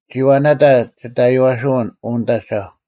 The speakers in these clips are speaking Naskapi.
ᒋᐛ ᓇᑕ ᒋᑦ ᐊᔽᓯᐅᓐ, ᐅ ᓂᑦ ᐊᒐᐧᒄ;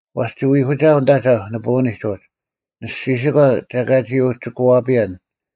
ᐛᔅ ᒋ ᐎᒂᒋᐊᐤ ᓂᑦ ᐊᒐᐧᒄ ᓂᐳᐅᓂᒡ ᐅᒡ, ᓂᔅᒋᓯᒂ ᒐ ᐊᑲ ᒋ ᐅᒋᑯᐛᐱᔭᓐ,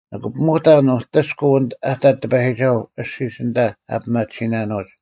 ᓂᑭ ᐱᒧᑕᓐ ᐅᑎᔅᑯᐤ ᐊ ᑕᑦ ᑎᐸᔨᒋᒐᓱᐤ ᐊᔅᒋᒡ ᐊᓐᑕ ᐊ ᐱᒪᑎᓯᓇᓄᐅᒡ᙮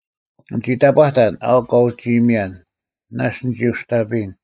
ᓂᒋ ᑕᑈᑕᓐ, ᐊᐅᒄ ᑲ ᐅᒋ ᐃᔨᒥᔭᓐ: “ᓇᔅᒡ ᓂᒋ ᐅᔅᑕᐱᔨᓐ᙮”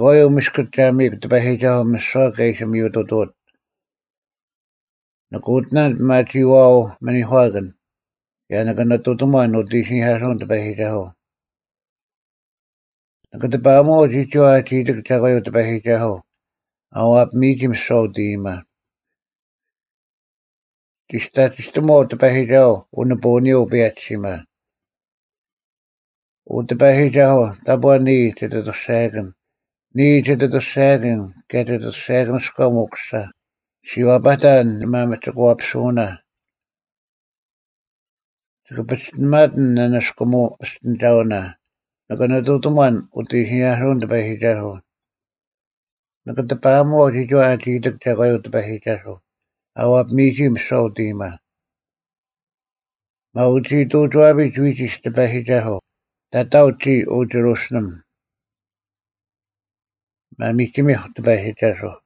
(Easter-3 Year A) 12ᒐᒂᔪᐤ ᒥᔅᑯᒡ ᒐ ᒥᔨᒃ ᑎᐸᔨᒋᒐᓱᐤ ᒥᓯᐛ ᑲ ᐃᓯ ᒥᔪ ᑐᑐᐅᑦ? 13ᓂᑭ ᐅᑎᓇᓐ ᐱᒪᒋᐃᐛᐤ ᒥᓂᒂᑭᓐ, ᑭᔭ ᓂᑭ ᓂᑐᑎᒺᓐ ᐅᑦ ᐃᓯᓂᐧᑲᓱᐅᓐ ᑎᐸᔨᒋᒐᓱᐤ᙮ 14ᓂᑭ ᑎᐸᐊᒧᐛᐤ ᒋᒋᐛ ᐊᒋ ᐃᑎᒃ ᒐᒂᔪᐤ ᑎᐸᔨᒋᒐᓱᐤ ᐊ ᐛᐱᒥᔨᒋ ᒥᓯᐛ ᐅᑦ ᐃᔨᒪ᙮ 15ᒋᔅᑕᒋᑕᒺᐤ ᑎᐸᔨᒋᒐᓱᐤ ᐅᓂᐳᐅᓂᔪᐤ ᐅᐸᔭᒋᓯᒪ᙮ 16ᐅ ᑎᐸᔨᒋᒐᓱᐤ, ᑕᑈ ᓂᔾ ᒋᑦ ᐊᑐᔅᒐᔭᑭᓐ; ᓂᔾ ᒋᑦ ᐊᑐᔅᒐᔭᑭᓐ, ᑭᔭ ᒋᑦ ᐊᑐᔅᒐᔭᑭᓂᔎᒻ ᐅᑯᓯᓴ: ᔅᒋ ᐛᐸᑕᓐ ᓂᒥᒪᒋᒂᐱᓱᐅᓇ᙮ 17ᒋᑭ ᐸᒋᑎᓇᒪᑎᓐ ᓂᓇᔅᑯᒧᐅ ᐱᔅᑎᓂᒐᐅᓇ, ᑭᔭ ᓂᑭ ᓂᑐᑎᒺᓐ ᐅᑦ ᐃᓯᓂᐧᑲᓱᐅᓐ ᑎᐸᔨᒋᒐᓱᐤ᙮ 18ᓂᑭ ᑎᐸᐊᒧᐛᐤ ᒋᒋᐛ ᐊᒋ ᐃᑎᒃ ᒐᒂᔪᐤ ᑎᐸᔨᒋᒐᓱᐤ ᐊ ᐛᐱᒥᔨᒋ ᒥᓯᐛ ᐅᑦ ᐃᔨᒪ᙮ 19ᒪᐅᒋᐃᑐᐅᒋᐛᐱᒡ ᐎᒋᒡ ᑎᐸᔨᒋᒐᓱᐤ, ᑕᑕᐅᒡ ᒋᔾ, ᐅ ᒋᕈᓯᓕᒻ᙮ ᒪᒥᒋᒥᐧᒄ ᑎᐸᔨᒋᒐᓱᐤ!